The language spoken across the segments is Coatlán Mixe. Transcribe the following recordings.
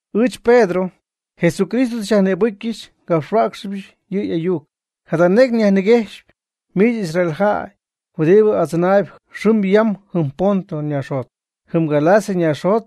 Ɨɨch Pedro, Jesucristo tɨ xyajnïbɨcyɨch ngapxhuäcxɨbɨch yɨ' y'ayuc. Jada necy nyajniguejxyp miich Israel jäy huɨdibɨ adzɨnaayb xɨm yam jɨm Ponto naaxjot, jɨm Galacia naaxjot,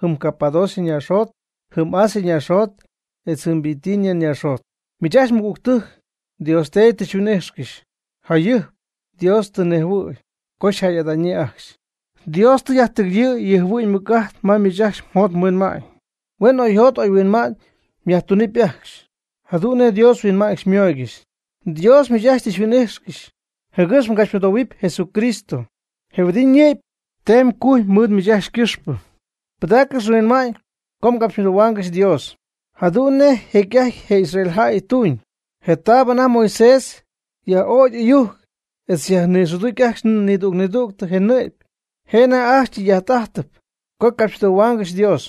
jɨm Capadocia naaxjot, jɨm Asia naaxjot etz jɨm Bitinia naaxjot. Miich ajcxy mɨgügtɨjc Dios Teedy tɨ xyhuin'ijxcɨxy, jayɨjp Dios tɨ nejhuɨ̈y co xyjäy'ada'ñyii ajcxy. Dios tɨ yajtɨgɨyɨ̈y yɨ' yjɨhuɨ'ñ ymɨc'ajt ma miich ajcxy mjot mhuinma'ñ, huen oyjot oyhuinma'ñ myajtunɨpy ajcxy jadu'n nej Dios huinma'ñ xymooygɨxy. Dios miich ajcxy tɨ xyhuin'ixy jɨgɨx mgapxymɨdohuɨpy Jesucristo, je huɨdib ñɨ'py teem cuj mɨɨd miich ajcxy ycɨxpɨ. Pɨdaaccɨx mhuinma'ñ co mgapxymɨdohuaangɨxy Dios jadu'n nej jecy'ajty je Israel jäy ytuñ, je taab anajty Moisés yaj'ögy ɨyujc etz yajnïxɨdicxy ajcxy nidüg nidüg je nɨ'py, je' anajty ajcxy ytɨy'ajt'ajtɨpy co capxymɨdohuaangɨxy Dios.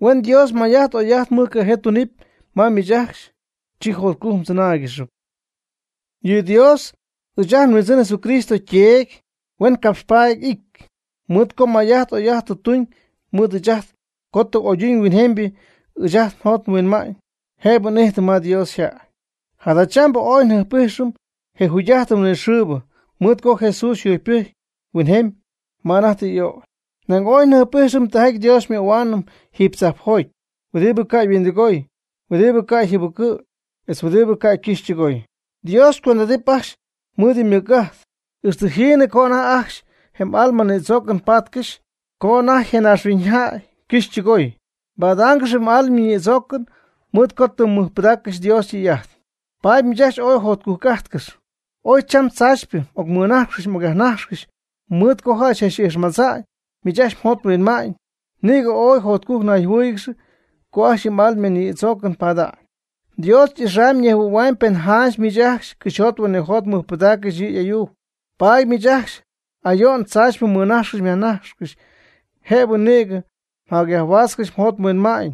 Huen Dios may'ajt oy'ajt mɨjcajee tunɨpy ma miich ajcxy, chi jotcujc mdzɨnáaygɨxɨpy. Yɨ Dios, ɨɨch ajt nHuindzɨn Jesucristo yTeedy, huen capxpaady y'ity, mɨɨd co may'ajt oy'ajt tɨ tuñ mɨɨd ɨɨch ajt co tɨ oyduñ huinjemybɨ ɨɨch ajt njot nhuinma'ñ, jëbɨ n'ijtɨm Dios yjäy. Jadachambɨ ooy njɨjp'ijxɨm je jugy'ajtɨn huinɨxɨɨbɨ, mɨɨd co Jesús yjugypɨjcy huinjemy ma anajty tɨ y'ögy. Nañ ooy njɨjp'ijxɨm tijaty Dios xymöhuaanɨm jiiby tzajpjoty, huɨdibɨ ca' yhuindɨgoy, huɨdibɨ ca' yjɨbɨcɨ̈y, etz huɨdibɨ ca' ycɨxy ytɨgoy. Dios xycuend'adɨp ajcxy mɨɨd yɨ' ymɨc'ajt, ixtɨ jiinɨ co anajty ajcxy je m'alma nïdzoocɨn padaangɨxy, co anajty je naaxhuiñ ycɨxy ytɨgoy. Mbadaangɨxy m'alma nïdzoocɨn mɨɨd co tɨ mmɨjpɨdaaccɨxy Dios ytɨy'ajt. Paady miich ajcxy ooy jotcujc'ajtcɨxp. Oy cham tzaachypɨ m'ocmɨnajxcɨxy m'ocyajnajxcɨxy mɨɨd co jäy tzach'ijxmadza'ñ miich ajcxy mjot mhuinma'ñ. Nïgɨ ooy jotcujc nayjɨhuɨ́ɨyɨgɨxy co ajcxy yɨ m'alma nïdzoocɨn pada'ñ. Dios y'ixamyb ñejhuɨ̈huamyb pen janch miich ajcxy cɨxyjot huinɨjot mmɨjpɨdaaccɨxy yɨ' y'ayuc. Paady miich ajcxy ayo'n tzaachypɨ mmɨnajxcɨxy myajnajxcɨxy jëbɨ nïgɨ myajhuaatzcɨxy mjot mhuinma'ñ,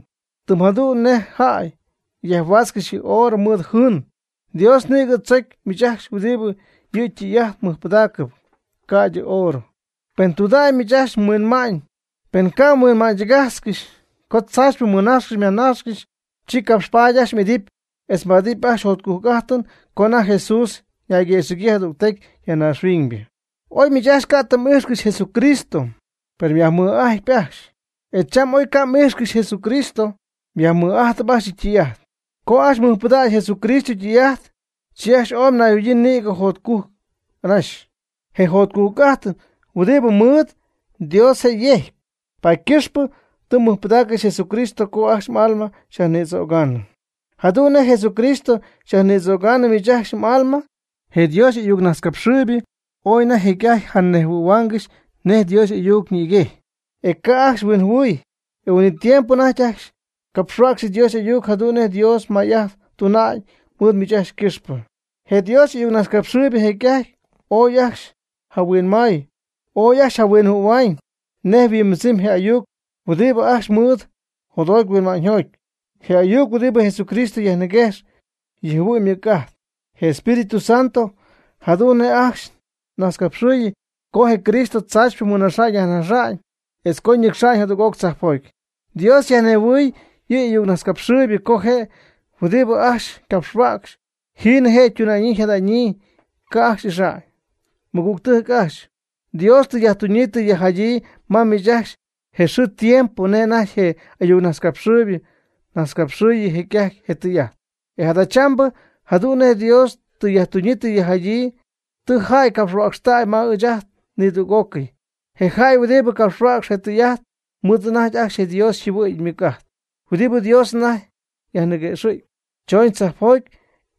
tɨm jadu'n nej jäy yajhuaatzcɨxy yɨ oorɨ mɨɨd jɨɨn. Dios nïgɨ tzocy miich ajcxy huɨdib yɨ' ytɨy'ajt mɨjpɨdaaccɨp, ca'ydɨ oorɨ. Pen tudägy miich ajcxy mhuinma'ñ, pen ca' mhuinma'ñytɨgajtzcɨxy co tzaachypɨ mmɨnajxcɨxy myajnajxcɨxy, chi capxpaady ajcxy m'idɨpy etz mbaadɨpy ajcxy jotcujc'ajtɨn co anajty Jesús ñayguëxɨ̈gyii jadügtecy ya naaxhuiñybɨ. Oy miich ajcxy ca' tɨ m'ijxcɨxy Jesucristo, per myajmɨj'ajtpy ajcxy, e cham oy ca' m'ijxcɨxy Jesucristo, myajmɨj'ajtɨp ajcxy yɨ' ytɨy'ajt. Co ajcxy mmɨjpɨdaacɨ Jesucristo ytɨy'ajt, chi ajcxy ooy mnayjɨhuɨ̈yii nïgɨ jotcujc anaxy. Je jotcujc'ajtɨn huɨdib mmɨɨd Dios je' yejcp. Paady ycɨxpɨ tɨ mmɨjpɨdaaccɨxy Jesucristo co ajcxy m'alma xyajnïdzögaanɨ. Jadu'n nej Jesucristo xyajnïdzögaanɨ miich ajcxy m'alma je Dios y'ayuc najtzcapxɨɨybɨ ooy anajty jecy'ajty janejhuɨ̈huaangɨxy nej Dios y'ayuc ñïguejy, e ca' ajcxy huinjɨhuɨɨy, je huin'it tiempo anajty ajcxy capxhuäcxp Dios y'ayuc jadu'n nej Dios may'ajt tuna'ñ mɨɨd miich ajcxy ycɨxpɨ. Je Dios y'ayucnajtzcapxɨɨybɨ jecy'ajty ooy ajcxy jahuinmay, ooy ajcxy jahuinjɨhuɨ̈huaañ nej yhuimbɨdzɨmy je ayuc huɨdibɨ ajcxy ymɨɨd jotjoty huinma'ñyjoty, je ayuc huɨdibɨ Jesucristo yajmɨguejx yɨ' yjɨhuɨ'ñ ymɨc'ajt, je Espíritu Santo, jadu'n nej ajcxy najtzcapxɨɨy co je Cristo tzaachypɨ mɨnaxa'ñ yajnaxa'ñ, etz co ñɨcxa'ñ jadüg'oc tzajpjoty. Dios yajnejhuɨɨy yɨ' y'ayucnajtzcapxɨɨybɨ co je' huɨdib ajcxy ycapxhuäcx jiinɨ je' ytuna'ñyii yjada'ñyii, ca' ajcxy ixa'ñ. Mɨgügtɨjc ajcxy, Dios tɨ yajtuunyii tɨ yajjadyii ma miich ajcxy je mxɨɨ mdiempo nej anajty je' y'ayucnajtzcapxɨɨybɨ najtzcapxɨɨy jecy'ajty je tɨy'ajt. E jadachambɨ jadu'n nej Dios tɨ yajtuñyii tɨ yajjadyii tɨ jäy capxhuäcxtäy ma ɨɨch ajt nidüg'ócɨy. Je jäy huɨdibɨ capxhuäcx je tɨy'ajt ymɨɨd anajty ajcxy je Dios yjɨhuɨ'ñ ymɨc'ajt huɨdibɨ Dios anajty yajniguejxɨp, chooñ tzajpjoty.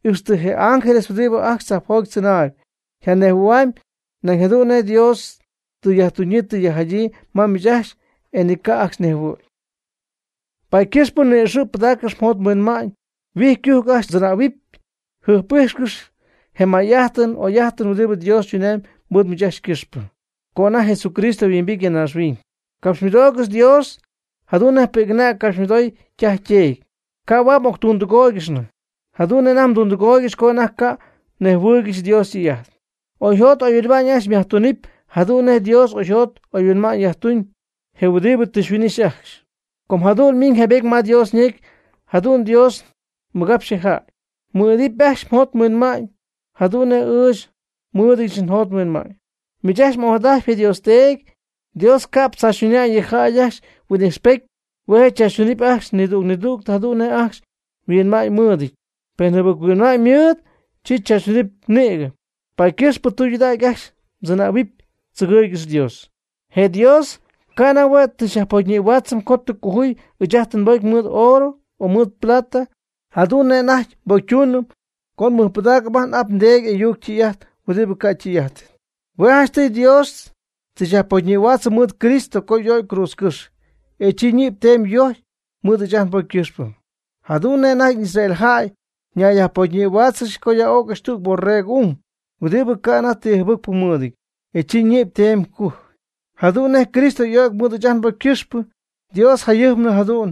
Ixtɨ je ángeles huɨdibɨ ajcxy tzajpjoty tzɨnaayb yjanejhuɨ̈hua'ñ nañ jadu'n nej Dios tɨ yajtuñyii tɨ yajjadyii ma miich ajcxy, e ni ca' ajcxy nejhuɨ̈y. Paady ycɨxp ni'ixɨ̈ pɨdaaccɨx mjot mhuinma'ñ. Huijy ycujc ajcxy mdzɨnähuɨp. Jɨjp'ijxcɨx je may'ajtɨn oy'ajtɨn huɨdibɨ Dios tunamyb mɨɨd miich ajcxy ycɨxpɨ co anajty Jesucristo yhuimbity ya naaxhuiñ. Capxymɨdoogɨx Dios jadu'n nej pi'c'anäg capxymɨdoogɨxy ytaj yteedy. Ca' huaad m'octundɨgóoygɨxnɨ jadu'n nej anajty mdundɨgooygɨxy co anajty ca'nɨ mnejhuɨɨygɨxy Dios ytɨy'ajt. Oyjot oyhuinma'ñ ajcxy myajtunɨpy jadu'n nej Dios oyjot oyhuinma'ñ yajtuñ, je huɨdibɨ tɨ xyhuin'ixy ajcxy. Com jadu'n ymiiñ jaybety ma Dios ñecy, jadu'n Dios mɨgapxy je' yjäy: “Mɨ'idɨp ajcxy oyjot oyhuinma'ñ jadu'n nej ɨɨch nmɨ'ityɨch oyjot oyhuinma'ñ.” Miich ajcxy m'ojadajtpy je Dios Teedy. Dios ca'p tzaachytuna'ñ yɨ jäy ajcxy huin'ixpety. Hue' je' chaachytunɨpy ajcxy nidüg nidüg jadu'n nej ajcxy yhuinma'ñymɨɨdɨty, pen jɨbɨc-huinma'ñ ymɨɨd, chi tzaachytunɨpy nïgɨ. Paady ycɨxp tɨydudägy ajcxy mdzɨnähuɨpy. Tzɨgɨɨygɨx Dios. Je Dios canan hue' tɨ xyajpocyñïhuaatzɨm co tɨ cojuy ɨɨch ajt nbocy mɨɨd oorɨ o plata, jadu'n nej anajty nbocytuunɨm co nmɨjpɨdaacɨm n'ap ndeedy y'ayuc ytɨy'ajt huɨdibɨ ca' ytɨy'ajtɨty. Hue' janchtɨy Dios tɨ xyajpocyñïhuaatzɨm mɨɨd Cristo co y'o'cy cruudzcɨ́xy, e chi ñɨ'py teemy yojcy mɨɨd ɨɨch ajt nbocy ycɨxpɨ. Jadu'n nej anajty Israel jäy ñayyajpocyñïhuáatzɨgɨxy co yaj'ögy tüg boregɨ ung, huɨdibɨ ca' anajty ti jɨbɨcpɨ mɨɨdɨty, e chi ñɨ'py teemɨ cujɨ. Jadu'n nej Cristo y'o'cy mɨɨd ɨɨch ajt nbocy ycɨxpɨ, Dios jayɨjpnɨ jadu'n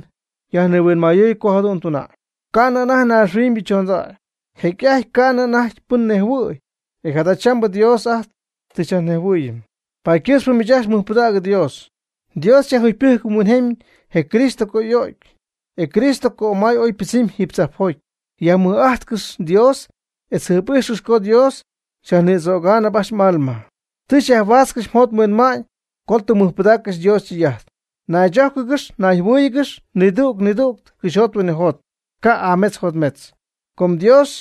yajnihuinmayɨɨy co jadu'n tuna'ñ, ca'nɨ anajty naaxhuiñybɨ chondägy. Jecy'ajty ca'nɨ anajty pɨn nejhuɨ̈y, e jadachambɨ Dios ajt tɨ xyajnejhuɨɨyɨm. Paady ycɨxp miich ajcxy mɨjpɨdägy Dios. Dios yajjugypɨjc huinjemy je Cristo co y'o'cy, e Cristo cömay ooy ypɨdzɨmy jiiby tzajpjoty. Yajmɨj'ajtcɨx Dios etz jɨjp'ijxcɨx co Dios xyajnïdzögaanɨp ajcxy m'alma. Tɨ myajhuaatzcɨxy mjot mhuinma'ñ co tɨ mmɨjpɨdaaccɨxy Dios ytɨy'ajt. Naychójcɨgɨx nayjɨhuɨ́ɨyɨgɨx nidüg nidüg cɨxyjot huinɨjot, ca' y'ametz yjotmetzɨty. Com tɨ Dios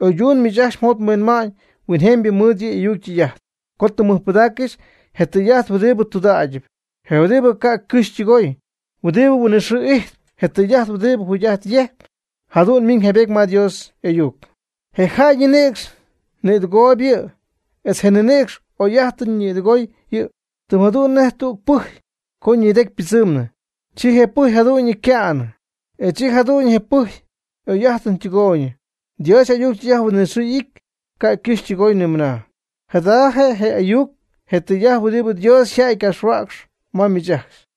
oyduñ miich ajcxy mjot mhuinma'ñ huinjemybɨ mɨɨd yɨ' y'ayuc ytɨy'ajt, co tɨ mmɨjpɨdaaccɨxy je tɨy'ajt huɨdibɨ tudägyɨp, je huɨdibɨ ca' ycɨxy ytɨgoy, huɨdibɨ huinɨxɨɨ ijtp, je tɨy'ajt huɨdibɨ jugy'ajt yejcpy. Jadu'n ymiiñ jaybety ma Dios y'ayuc: Je jäy ninïcx nidɨgooyb yɨ' etz je ninïcx y'oy'ajtɨn nidɨgooyb yɨ'. Tɨm jadu'n nej tüg pɨjy co ñidecy ytɨɨtznɨ, chi je pɨjy jadu'ñyɨ yca'nɨ, e chi jadu'ñyɨ je pɨjy y'oy'ajtɨn ytɨgooy. Dios y'ayuc ytɨy'ajt huinɨxɨɨ y'ity, ca' ycɨxy ytɨgooy nimɨna. Jada je ayuc je tɨy'ajt huɨdibɨ Dios yjäy ycapxhuäcxyp ma miich ajcxy.